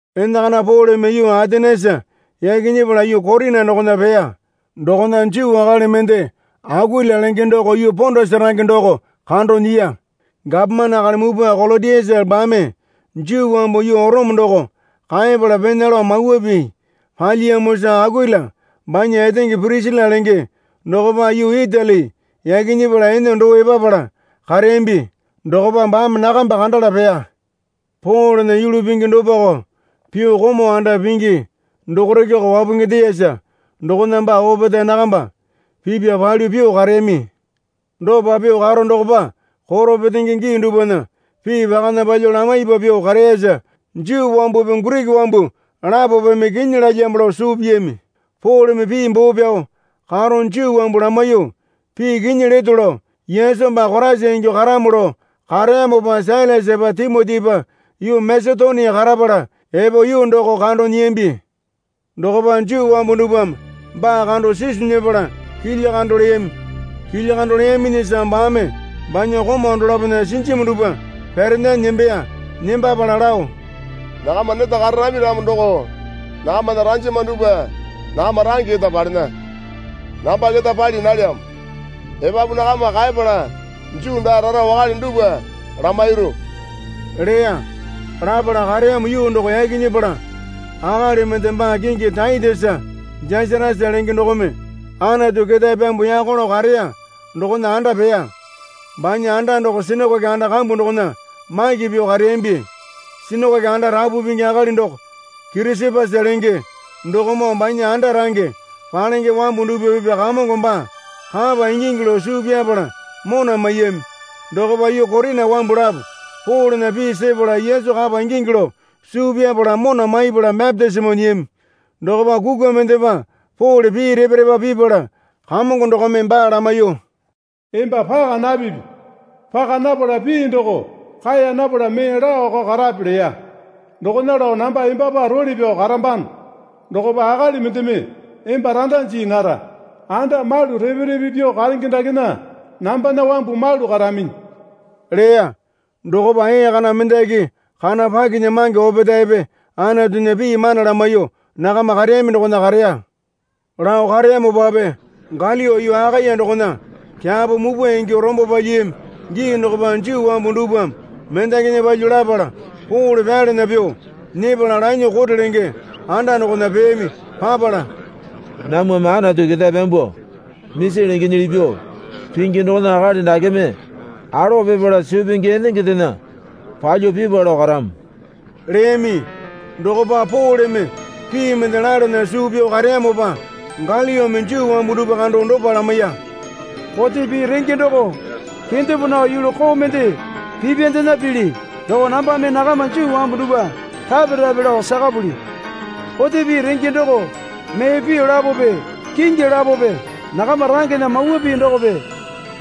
Enakana Poleme yuu Atenesa yaki nyepala yuu Korina dokona peya. Dokona Juu akali mende Akuila lenge doko yuu Pondasa range doko kando nyiya. Gapomane akali mupwa Kolotiasa baame Juu wambu yuu Orome doko kaepala pena lao mawa pii palyiyamosa Akuila banya etenge Pirisila lenge dokopa yuu Itali yaki nyepala ene doo epapala kareyambi. Dokopa baame nakamba kandala peya. Polena yulu pingi dopako pyuo komau anda pingi dokorekeko wapungindeyasa dokona baa opetae nakamba pipya palyuo pyuo kareyami. Dopa pyuo karo dokopa koro petenge gii dupwana pii pakana palyuo lamaipa pyuo kareyasa Juu wambupi Giriki wambu lapopeme kinyi lalyamo lao suu piyami. Poleme pii boo pyao karo Juu wambu lamaiyuo pii kinyi leto lao Yesu baa Koraisa ingyuo karamo lao kareyamopa Sailasapa Timotipa yuu Masetonia karapala epo yuu doko kando nyiyambi. Dokopa Juu wambu dupwame baa kando sisu nyepala kilya kando leyami. Kilya kando leyaminyisa baame banya komau dolapona sinjumi dupwa pyarandanyi nembeya. Nembapala lao, Nakama neta kararami ramo doko nakamana ranjama dupwa nakama range keta palena, namba keta pali nalyamo. Epapu nakama kaepala Juu daa rara wakale dupwa lamairu leya. Lapala kareyamo yuu doko yaki nyepala akali mende baa kingi Taitesa Jasatasa lenge dokome Anatu ketae pyambuo yako lao kareya dokona anda peya. Banya anda doko sinakoke anda kambu dokopa maki pyuo kareyambi. Sinakoke anda rapu pingi akali doko Kirisapasa lenge dokomoo banya anda range palenge wambu dupwa pipya Kamongo baa kapa ingingi lao suu pyapala mona maiyami. Dokopa yuu Korina wambu lapo Polena pii sepala Yesu kapa ingingi lao suu pyapala mona maipala bapitisimo nyiyami. Dokopa kukwa mendepa Pole pii repa repa pipala Kamongo dokome baa lamaiyuo, Emba paka napipi. Paka napala pii doko kaeya napala mee laoko karape, leya. Dokona lao namba embapa role pyao karambano. Dokopa akali mendeme emba randa jii nara. Anda malu repe repe pyuo karenge dakena nambana wambu malu karaminyi leya. Dokopa ee kana mendaki kana pakinyamange opetaepe Anatunya pii mana lamaiyuo nakama kareyami dokona kareya. Lao kareyamopape Galio yuu Akaya dokona kyapo mupwa ingyuo rombo palyiyami gii dokopa Juu wambu dupwame mendakinya palyuo lapala Pole pyalana pyuo nyepala lanyuo kote lenge anda dokona peyami. Papala, Namwame Anatu ketae pyambuo misi lengenyili pyuo pingi dokona akali dakeme alowa pipala suu pingi enengendena palyuo pipwa lao karamo leyami. Dokopa Poleme pii mende lalana suu pyao kareyamopa Galiome Juu wambu dupwa kando dopa lamaiya. Kote pii renge doko kendepo nao yulu koo mende pipyandena pili doko nambame nakama Juu wambu dupwa rape rape lao sakapuli. Kote pii renge doko mee pii lapope kingi lapope nakama rangena mawa pii dokope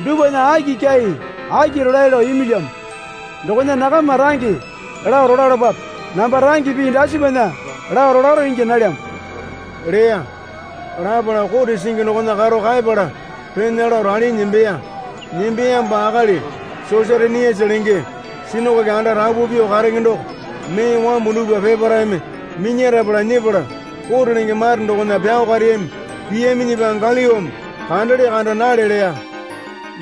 dupwana aki kyai aki rolae lao imilyamo, dokona nakama range lao rolalapape. Namba range pii dasipana lao rolaro ingya nalyamo leya. Lapala kote singi dokona karo kaepala pena lao ralinyi nembeya. Nembeyamopa akali Sosatenisa lenge sinakoke anda rapu pyuo karenge doko mee wambu dupwa peparaeme minyarapala nyepala kote lenge mare dokona pyao kareyami. Piyaminyipa Galiome kandele kanda nale leya.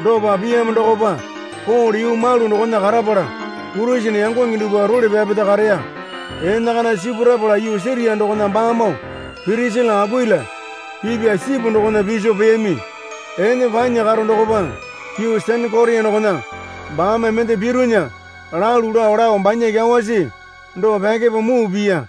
Dopa piyamo dokopa Pole yuu malu dokona karapala Kurisene yangonge dupwa role pyapeta kareya. Enakana sipurapala yuu Siria dokona baamoo Pirisila Akuila pipya sipu dokona piso peyami. Ene panya karo dokopa yuu Senekoria dokona baame mende pironya lalu lao lao banya kyawasi doko pyakepo muu piya.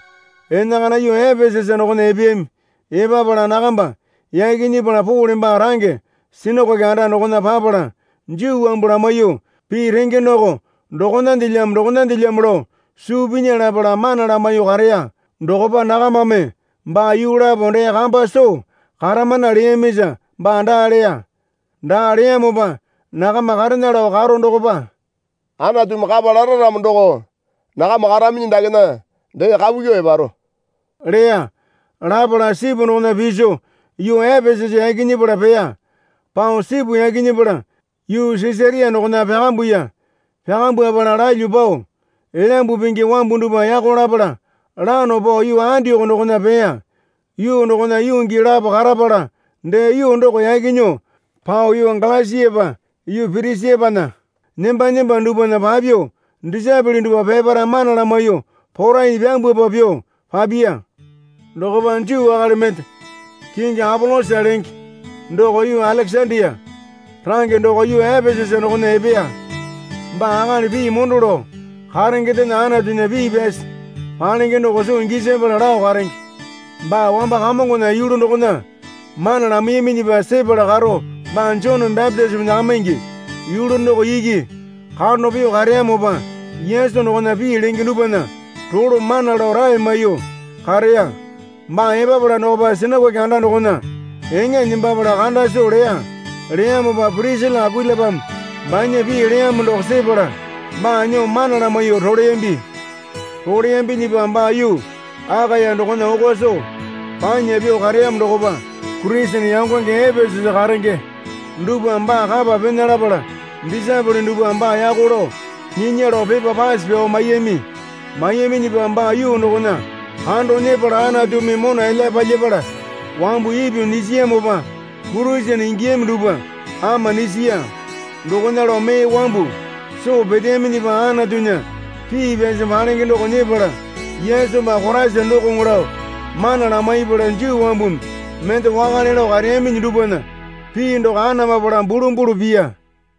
Enakana yuu Epesasa dokona epeyami. Epapala nakamba yaki nyepala Pole baa range sinakoke anda dokona papala Juu wambu lamaiyuo pii renge doko dokonandelyamo dokonandelyamo lao suu pinya lapala mana lamaiyuo kareya. Dokopa nakamame baa yuu lapo dee kambu soo karamana leyamisa baa daa leya. Daa leyamopa nakama karena lao karo dokopa, Anatumi kapa lara ramo doko nakama karaminyi dakena dee kapu kyuo eparo leya. Lapala sipu dokona piso yuu Epesasa yaki nyepala peya. Pao sipu yaki nyepala yuu Sisaria dokona pyakambuya. Pyakambwapala lalyuo pao Elyambu Pingi wambu dupwa yako lapala lano pao yuu Andioko dokona peya. Yuu dokona yuu gii lapo karapala dee yuu doko yaki nyuo pao yuu Galasiapa yuu Pirisiapana nemba nemba dupwana papyuo disaepole dupwa peparae mana lamaiyuo porainyi pyambwapa pyuo papiya. Dokopa Juu akali mende kingi Apolosa lenge doko yuu Alekesandia range doko yuu Epesasa dokona epeya. Baa akali pii mondo lao karengendena Anatunya pii pyasi palenge doko soo gisapala lao karenge. Baa wamba Kamongona yulu dokona mana lamaiyaminyipa sepala karo baa Joneme bapitisimo nyakamaingi yulu doko iki kando pyuo kareyamopa Yesu dokona pii lenge dupwana rolo mana lao rae maiyuo kareya. Baa epapala dokopa sinakoke anda dokona eŋa nembapala kanda soo leya. Leyamopa Pirisila Akuilapame banya pii leyamo doko sepala baa nyuo mana lamaiyuo roleyambi. Roleyambinyipa baa yuu Akaya dokona oko soo panya pyuo kareyamo dokopa Kurisene yangonge Epesasa karenge dupwame baa kapa pena lapala disaepole dupwame baa yako lao nyinya lao pepa pase pyao maiyami. Maiyaminyipa baa yuu dokona kando nyepala Anatumi mona elyape palyapala, wambu ipyuo nyisiyamopa Kurisene ingiyami dupwa ama nyisiya. Dokona lao mee wambu soo peteyaminyipa Anatunya pii pyasi palenge doko nyepala Yesu baa Koraisa dokoŋo lao mana lamaipala Juu wambumi mende wakale lao kareyaminyi dupwana pii doko anamapala bulumbulu piya.